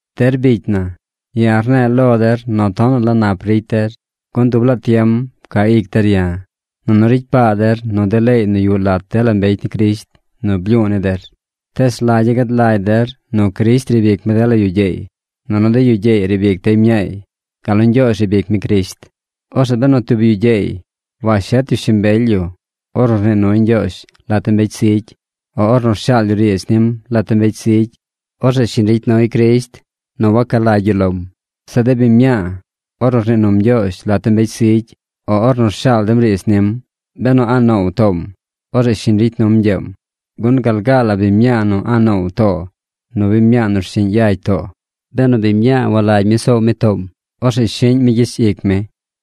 Der bicy na, ya̱ rne̱e̱ lo der nu tonaꞌ la nap ricy der, gun dub laa tiem ca ic der ya̱, nunu ricy paa der nu de leey nu yuꞌ lat dela mbecy ni Crisht nu blyu̱u̱ ni der. Tees rlagya̱ gad lagy der nu Crisht riib ic mi dela yu gyeey, nunu de yu gyeey riib ic dey mñaay, gal nu Ñgyoozh riib ic mi Crisht. Orzeꞌ benu tub yu gyeey washet yu shimbely yu ornu rnii nuy Ñgyoozh lat de mbecy zigy o ornu rshaal yu riidz nim lat de mbecy zigy, orzeꞌ shiñ ricy nuy Crisht nu waca lagy yu lom. Zeꞌ de biñ mñaa, ornu rnii num Ñgyoozh lat de mbecy zigy o ornu rshaal dem riidz nim, benu a̱ꞌ noow toom, orzeꞌ shiñ ricy num ñgyeem. Gun gal gaa la biñ mñaa nu a̱ꞌ noow too nu biñ mñaa nu rshiꞌñ yagy too. Benu biñ mñaa walagy mi nu soow mi toom, orzeꞌ shiꞌñ mi gyich ic mi.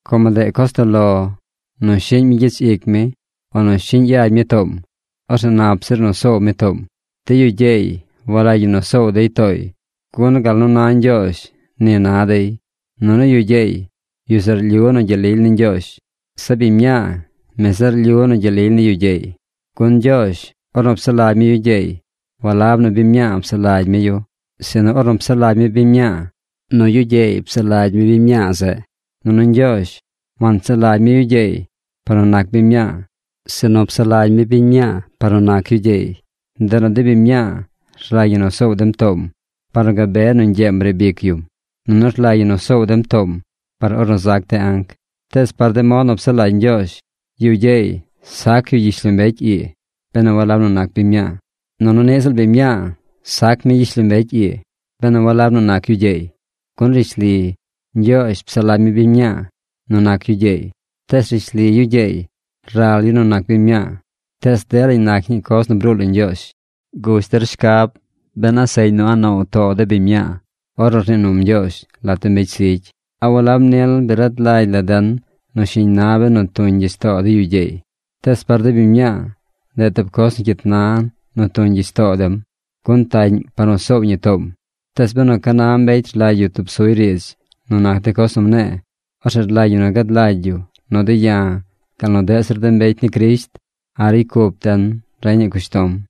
Como ndeꞌ coz toꞌ lo nu shiꞌñ mi gyich ic mi o nu shiꞌñ yagy mi toom, orzeꞌ nap zir nu soow mi toom. De yu gyeey walagy ñi nu soow dey tooy, gun gal nu na Ñgyoozh, ni na dey, nunu yu gyeey, yu zeꞌ rlyu nu gyel lily ni Ñgyoozh. Zeꞌ biñ mñaa, mi zeꞌ rlyu nu gyel lily ni yu gyeey. Gun Ñgyoozh, ornu psaꞌ lagy mi yu gyeey, walab nu biñ mñaa psaꞌ lagy mi yu. Sinu ornu psaꞌ lagy mi biñ mñaa, nu yu gyeey psaꞌ lagy mi biñ mñaa zeꞌ. Nunu Ñgyoozh wansaꞌ lagy mi yu gyeey par nu nac biñ mñaa, sinu psaꞌ lagy mi biñ mñaa par nu nac yu gyeey. Ndeꞌ nu de biñ mñaa rlagy ñi nu soow dem toom: par nu gabe nu ñgyeem riib ic yum. Nunu rlagy ñi nu soow dem toom par ornu zac de anc. Tees par mod nu psaꞌ lagy Ñgyoozh, yu gyeey sac yu gyishlombecy ii benu walab nu nac biñ mñaa. Nunu niꞌ ziꞌl biñ mñaa sac mi gyishlombecy ii benu walab nu nac yu gyeey. Gun rishli Ñgyoozh psaꞌ lagy mi biñ mñaa nu nac yu gyeey, tees rishli yu gyeey ral yu nu nac biñ mñaa. Tees delañ nac ñii coz nu bruu lo Ñgyoozh. Gush der shcab ben a seꞌñ nu a̱ꞌ noow too de biñ mñaa ornu rnii num Ñgyoozh lat de mbecy zigy. ¿A walab nil bi rad lagy la den nu shiñ na benu tuñ gyich too de yu gyeey? Tees par de biñ mñaa, ndeꞌ tub coz nu cyit na nu tuñ gyich too dem, gun taꞌñ par nu soow ñi toom. Tees benu ca na mbecy rlagy yu tub suy riidz nu nac de coz nu mne̱e̱, orzeꞌ rlagy ñi nu gad lagy yu nu de̱ ya̱ gal nu deꞌ zir de mbecy ni Crisht a̱ꞌ ricy cup den reñaꞌ cushtom.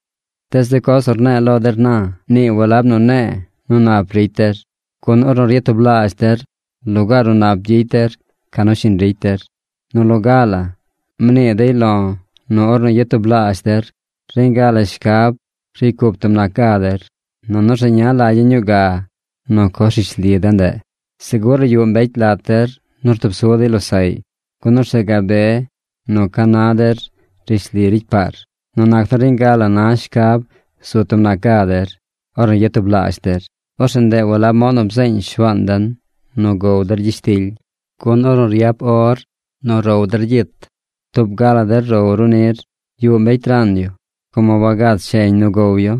Tees de coz nu ne̱e̱ lo der na, nii walab nu ne̱e̱ nu nap ricy der. Gun ornu ryatublaazh der, lugaar nu nap gyicy der ca nu shiñ ricy der. Nu loga la, mnii dey lo̱ nu ornu yatublaazh der, reñ ga la shcab ricy cup tub nac ga der. Nunu rzeña lagya̱ ñuu ga nu coz rishli de ndeꞌ. ¡Segur la yuꞌ mbecy lat der nu rtub su dey losaꞌy, gun orzeꞌ gabe nu ca na der rishli ricy paar! Nu nac nu reñ ga la na shcab zu tub nac ga der, ornu ryatublaazh der, orzeꞌ ndeꞌ walab mod nu bzeeñ Shuaan den nu gow der gyishtily. Gun ornu ryap or nu row der gyit, tub ga la der row ru nir. Yuꞌ mbecy ran yu, como wagad sheñ nu gow yu.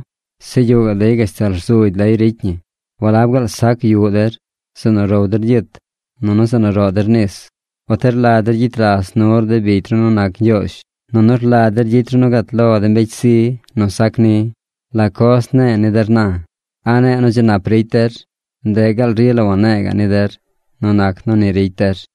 Zeꞌ yuꞌ gaꞌ dey gashtal rzugy lay ricy ñi. ¿Walab gaal sac yuꞌ der, zeꞌ nu row der gyit nunu zeꞌ nu roꞌ der nis? ¿Uti rlagy der gyicy ras nur de bicy ru nu nac Ñgyoozh, nunu rlagy der gyicy ru nu gat lo de mbecy zi nu sac ni? ¿La coz ne̱e̱ ni der na? ¿A ne̱e̱ nu dzi nap ricy der? ¡Ndeꞌ gaal rila wane̱e̱ ga̱ꞌ ni der nu nac nu ni ricy der!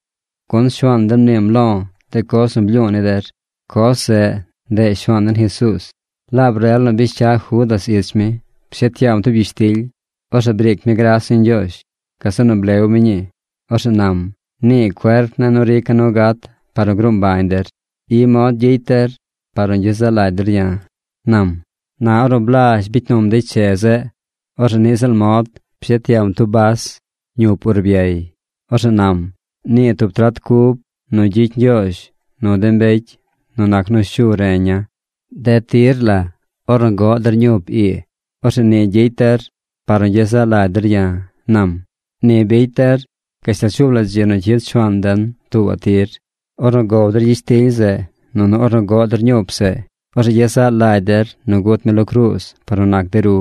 Gun Shuaan den mniim lo̱ de coz nu blyu̱u̱ ni der. Coz zeꞌ, ndeꞌ Shuaan den Jesuuz, laab rel nu bish cya Judas ich mi, pshet yaam tub gyishtily. Orzeꞌ briic mi gras ni Ñgyoozh. Gazeꞌ nu blew mi ñii. Orzeꞌ nam: “Nii cuerp ne̱ nu rica̱ nu gat par nu gruu mbañ der. I mod gyicy der par nu gyezaꞌ lagy der ya̱”, nam. Na ornu blazh bicy num dey che zeꞌ, orzeꞌ niꞌ ziꞌl mod, pshet yaam tub bas ñup urbyay. Orzeꞌ nam: “Nii tub trat cub nu gyicy Ñgyoozh nu de mbecy nu nac nu shu reña̱. De tir la ornu goꞌ der ñup ii, orzeꞌ ni gyicy der par nu gyezaꞌ lagy der ya̱”, nam. Ni bicy der gashtal shuub la dzi nu cyid Shuaan den tuubaꞌ tir. Ornu gow der gyishtily zeꞌ, nunu ornu goꞌ der ñup zeꞌ, orzeꞌ gyezaꞌ lagy der nu gut mi lo cruuz par nu nac de ru.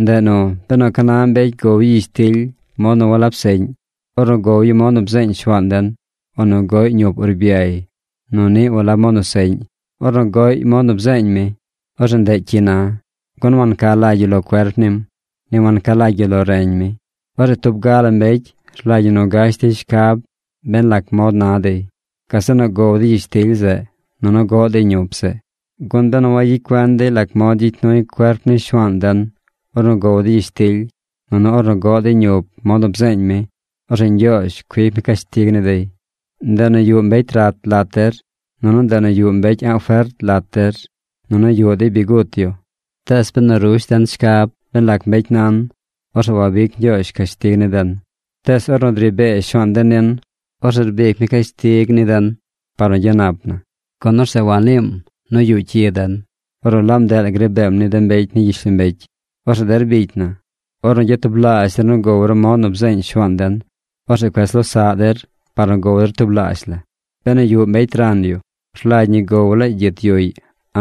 Ndeꞌ nu, benu ca na mbecy gow yu gyishtily mod nu walab seꞌñ, ornu gow yu mod nu bzeeñ Shuaan den, o nu goꞌy ñup urbyay nu niꞌ walab mod nu seꞌñ, ornu goꞌy mod nu bzeeñ mi, orzeꞌ ndeꞌ cyi na; gun wanca lagy yu lo cuerp nim, ni wanca lagy yu lo reñ mi. Orzeꞌ tub ga la mbecy rlagy ñi nu gash dey shcab ben lac mod na dey. Gazeꞌ nu gow dey gyishtily zeꞌ, nunu goꞌ dey ñup zeꞌ. Gun benu wayicy cuen dey lac gyicy nuy cuerp ni Shuaan den ornu gow dey gyishtily, nunu ornu goꞌ dey ñup mod nu bzeeñ mi, orzeꞌ Ñgyoozh cuic mi cashtig ni dey. Ndeꞌ nu yuꞌ mbecy rat lat der, nunu ndeꞌ nu yuꞌ mbecy a̱ꞌ fert lat der, nunu yuꞌ dey bi gut yu. Tees benu rush den shcab ben lac mbecy nan, orzeꞌ wabic Ñgyoozh cashtig ni den. Tees ornu dri bee Shuaan den nin, orzeꞌ rbic mi cashtig ni den par nu gyanap na, gun orzeꞌ waniim nu yuꞌ cyi den ornu laab ndeꞌ la gri beem ni de mbecy ni gyishlombecy. Orzeꞌ der bicy na, ornu gyatublaazh der nu gow ru mod nu bzeeñ Shuaan den, orzeꞌ cuez losaꞌ der par nu gow der tublaazh la. Benu yuꞌ mbecy ran yu, rlagy ñi gow laay gyit yuꞌy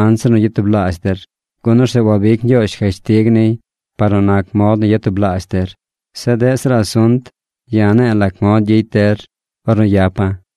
anzir nu gyatublaazh der, gun orzeꞌ wabic Ñgyoozh cashtig niy par nu nac mod nu yatublaazh der. Zeꞌ deꞌ zir asunt, ya̱ ne̱e̱ lac mod gyicy der ornu yapa̱.